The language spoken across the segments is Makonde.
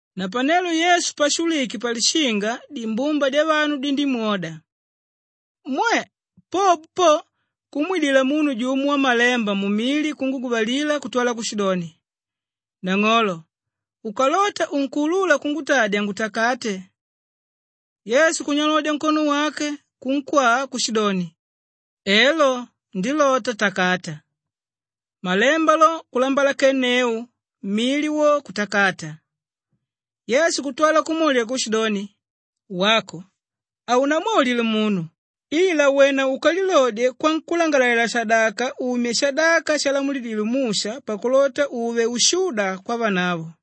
Napanelo Yesu pashulwike palishinga dimbumba dyavanu dindímwoda. Mwe! Popo po kumwidila munu jumo wamalemba mumili kunguguvalila kutwala kushidoni, “Nang'olo, ukalota unkuulula kungutadya ngutakate!” Yesu kunyalodya nkono wake kunkwaa kushidoni, “Elo ndilota, takata!” Malemba lo kulambalakenneu, mili wo kutakata. Yesu kutwala kumwaulila kushidoni, “Wako, haunamwaulile munu ila wena ukalilodye kwankúlangalalela-shadaka, umye shadaka shalamulidile Musha pakulota uve ushuda kwavanavo.”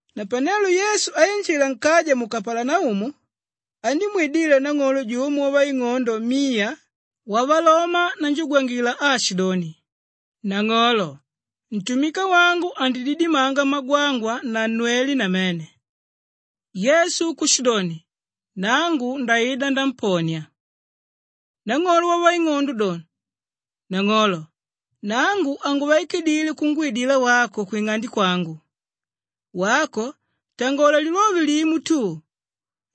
Napanelo Yesu ainjila nkaja mu Kapalanaumu andímwidila nang'olo jumo wavaing'ondo miya wavaloma nanjugwangila aashidoni, “Nang'olo, ntumika wangu andididimanga magwangwa na nnwele namene.” Yesu kushidoni, “Nangu ndaida namponia.” Nang'olo wavaing'ondo do, “Nang'olo, nangu hanguvaikidile kungwidila wako kwing'ande kwangu. Wako tangola lilove limo tu,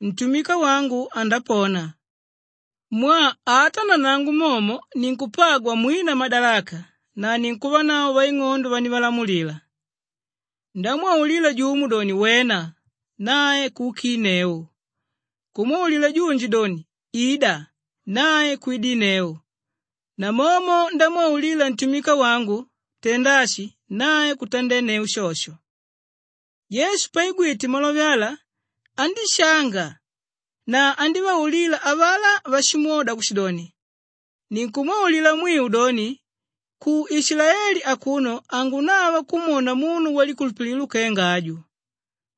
ntumika wangu andapona. Mwaa ata nanangu momo ninkupagwa mwina madalaka na ninkuvanavo vaing'ondo vandivalamulila. Ndámwaulila jumo doni, ‘Wena!’ Nae kuukinneu. Kumwaulila junji doni, ‘Ida!’ Nae kwidinneu. Namomo ndámwaulila ntumika wangu, ‘Tenda ashi!’ Nae kutandenneu shosho.” Yesu paigwite malove ala andíshanga na andívaulila avalá váshimwoda kushidoni, “Ninkumwaulila mwiu doni, ku Ishilaeli akuno hangunava kumwona munu walikulupililo kenga aju.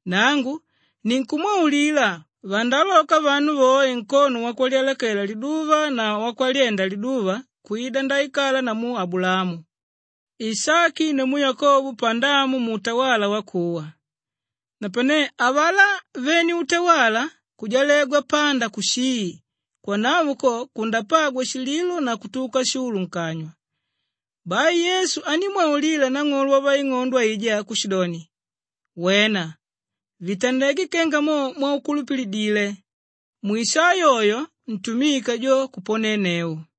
Nangu ninkumwaulila, vandaaloka vanu voe nkono wakwalyalakela liduva na wakwalyenda liduva kwida ndaikala namu Abulaamu, Ishaki namu Yakobo pandamu muutawala wakuwa napane avalá vene utawala kujalegwa panda kushii. Kwanavo ko kundapagwa shililo na kutuka shulu nkanywa.” Bai Yesu andímwaulila nang'olo wavaing'ondo aijá kushidoni, “Wena! Vitandeke kenga mo mwaukulupilidile.” Mwisaa yoyo, ntumika jo kuponneu.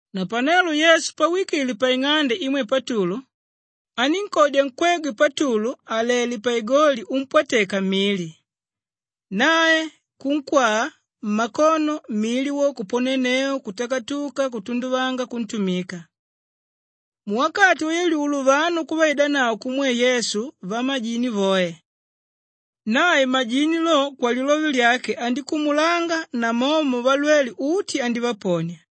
Napanelo Yesu pawikile paing'ande imwe Patulu anínkodya nkwegwe Patulu àlele paigoli umpwateka mili nae kunkwaa mmakono, mili wo kuponenneu kutakatuka kutunduvanga kuntumika. Muwakati wayalyulo vanu kuvaidanavo kumwe Yesu vamajini voe. Nae majini lo, kwalilove lyake andíkumulanga namomo valwele uti andívaponia.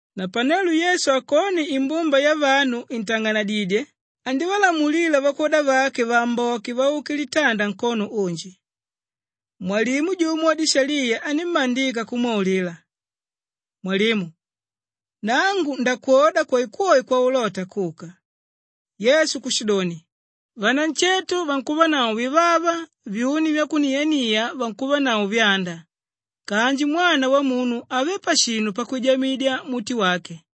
Napanelo Yesu akone imbumba yavanu intang'anadidye andívalamulila vakwoda vake vaamboke vauke litanda nkono unji. Mwalimu jumo wadishaliya anímmandika kumwaulila, “Mwalimu, nangu ndakwoda kwoekwoe kwaulota kuka.” Yesu kushidoni, “Vanansheto vankuvanavo vivava, vyuni vyakuniania vinkuvanavo vyanda kanji Mwana Wamunu havé pashinu pakwijamidya muti wake.”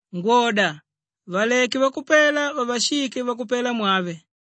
Yesu kushido, “Ngwoda! Valeke vakupela vavashike vakupelamwave.”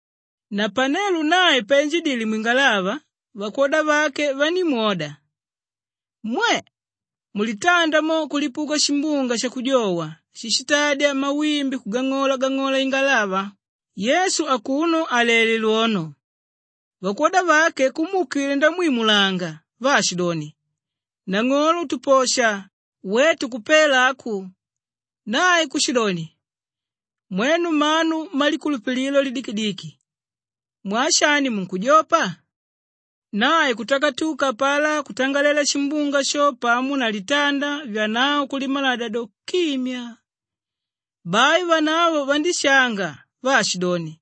Napanelo nae painjidile mwingalava vakwoda vake vandímwoda. Mwe! Mulitanda mo kulipuka shimbunga shakujowa shíshitadya mawimbi kugang'ola-gang'ola ingalava, Yesu akuno àlele lwono. Vakwoda vake kumuukila ndamwimulanga vaashidoni, “Nang'olo tuposha, wetu kupela aku!” Nae kushidoni, “Mwenu mmanu mmalikulupililo lidikidiki mwaa shani munkujopa?” Nae kutakatuka apalá kutangalela shimbunga sho pamo na litanda, vyanavo kulimaladya do, kimyaa. Bai vanavo vandíshanga vaashidoni,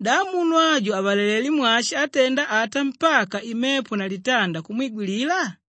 “Da munu aju avalalelé mwashi átenda ata mpaka imepo na litanda kumwigwilila?”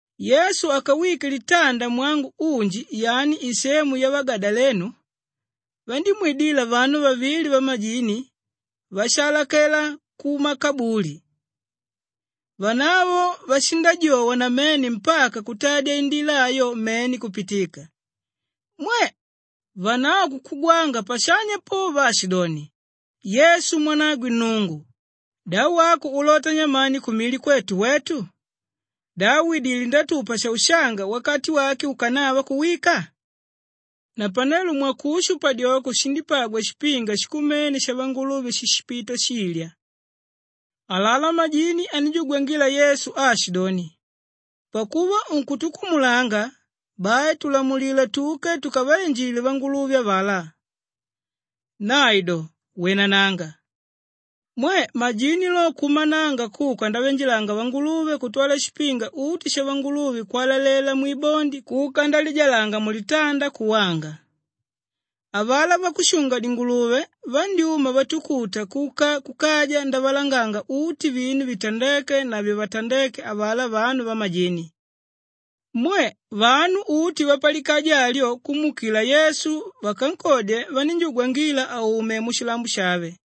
Yesu akawike litanda mwangu unji yani isemu yavagadalenu, vandímwidila vanu vavili vamajini váshaalakela kumakabuli. Vanavo vashindajowa namene mpaka kutadya indila ayo mene kupitika. Mwe! Vanavo kukugwanga pashanya po vaashidoni, “Yesu mwanagwe Nnungu! Da wako ulota nyamani kumili kwetu wetu? Da widilé ndatupa shaushanga wakati wake ukanava kuwika?” Napanelo mwakushu padyoko shindípagwa shipinga shikumene shavanguluve shíshipita shilya. Alalá majini anínjugwangila Yesu aashidoni, “Pakuva unkutukumulanga, bai tulamulila tuke tukavainjile vanguluve avalá.” Nae do, “Wenananga!” Mwe! Majini lo kuumananga kuka ndaviinjilanga vanguluve kutwala shipinga uti shavanguluve kwalalela mwibondi kuka ndalijalanga mulitanda kuwanga. Avalá vakushunga-dinguluve vandyúma vatukuta kuka kukaja ndavalanganga uti vinu vitandéke na vivatandéke avalá vanu vamajini. Mwe! Vanu uti vapalikaja alyo kumuukila Yesu. Vakankodye vanínjugwangila aume mushilambo shave.